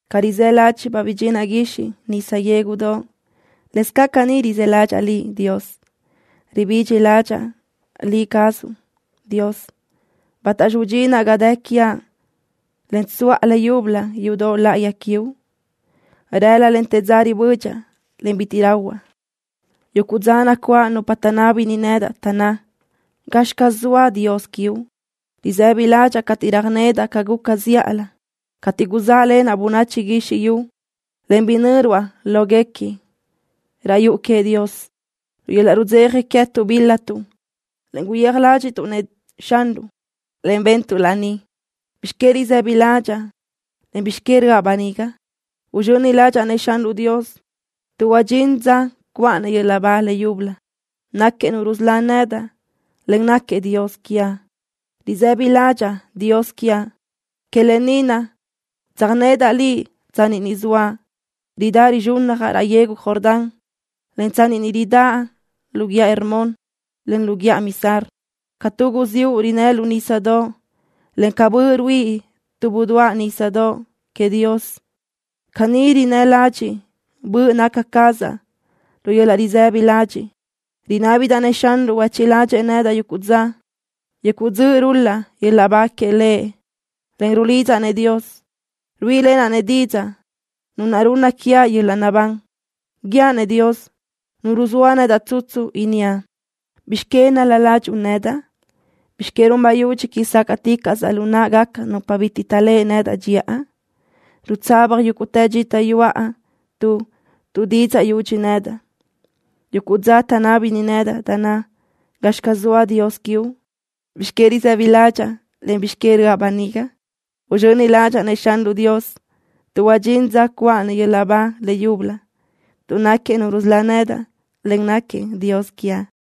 Ca rizë́ ládxiʼbaʼ bidxinaʼ guixiʼ nisa yégudoʼ, lëscaʼ caní rizë́ ládxaʼa Liʼ, Dios. Ribidxi ládxaʼa Liʼ cazuʼ, Dios. ¿Bátaxi udxinaʼ ga dë quiaʼ, en tsuʼa le yúbölö yudoʼ láʼayi quiuʼ? Rëla, en te dza ribödxaʼ, en bitiʼ bi rahuaʼ. Yuguʼ dza nacuáʼ nupa taʼnábini nedaʼ, taʼnná: “¿Gazxi caz zoa Dios quiuʼ?” Risëbi ládxaʼa cateʼ röjnedaʼ ca guca zíʼalö, cateʼ guzáʼlenaʼ bönachi guizxi yu, en yöjnö́ruaʼ láhuilöguequi raʼ yuʼu queëʼ Dios. Lu yöl-laʼ rudzeja queë́tuʼ bíl-latuʼ, en guyéaj ládxiʼtuʼ-nëʼ Xanruʼ, en bentuʼ laní. ¿Bizx que risë́bidaʼ ládxaʼa, en bizx que röʼa böniga? Uzxöni ládxaʼa-nëʼ Xanruʼ Dios, tuʼ huadxín dza cuʼa-nëʼ yöl-laʼ ba le yúbölö. Náquiëʼ Nu rusölá nedaʼ, en náquiëʼ Dios quiaʼ. Risë́bidaʼ ládxaʼa, Dios quiaʼ. Que lë ni naʼ tsöjnedaʼ Liʼ tsanni ni zoaʼ, ridáʼ rizxúnnajaʼ raʼ yegu Jordán, en tsanni ni ridáʼ lu guíʼa Hermón, en lu guíʼa Mizar. Ca tu guziúʼ rinnë́ lu nísadoʼ, en ca bö ruíʼi tu budoáʼ nísadoʼ queëʼ Dios, caní rinnë́ ladxiʼ böʼ naca cazaʼ lu yöl-laʼ risëbi ladxiʼ. Rinábidaʼ-nëʼ Xanruʼ huéchiʼ ládxëʼë nedaʼ yuguʼ dza. Yuguʼ dzöʼ rul-laʼ yöl-laʼ ba queëʼ Lëʼ, en rulidzaʼ Dios, ruíʼilenaʼ-nëʼ didzaʼ, Nu naʼ runna quiaʼ yöl-laʼ naʼbán. Guíaʼ-nëʼ Dios, Nu ruzóa nedaʼ tsutsu, inníaʼ: ¿Bizx que nál-la ládxuʼu nedaʼ? ¿Bizx que run bayúdx quíʼi sácaʼticaʼsaʼ lu náʼagaca nupa bitiʼ taʼléʼe nedaʼ dxiʼa? Rutsaba yúguʼtë dxita yuʼa tuʼ tuʼdidzaʼ yudxi nedaʼ. Yuguʼ dza taʼnábini nedaʼ, taʼnná: “¿Gazxi caz zoa Dios quiuʼ?” ¿Bizx que risë́bidaʼ ládxaʼa, en bizx que röʼa böniga? Uzxöni ládxaʼa-nëʼ Xanruʼ Dios, tuʼ huadxín dza cuʼa-nëʼ yöl-laʼ ba le yúbölö, tuʼ náquiëʼ Nu rusölá nedaʼ, en náquiëʼ Dios quiaʼ.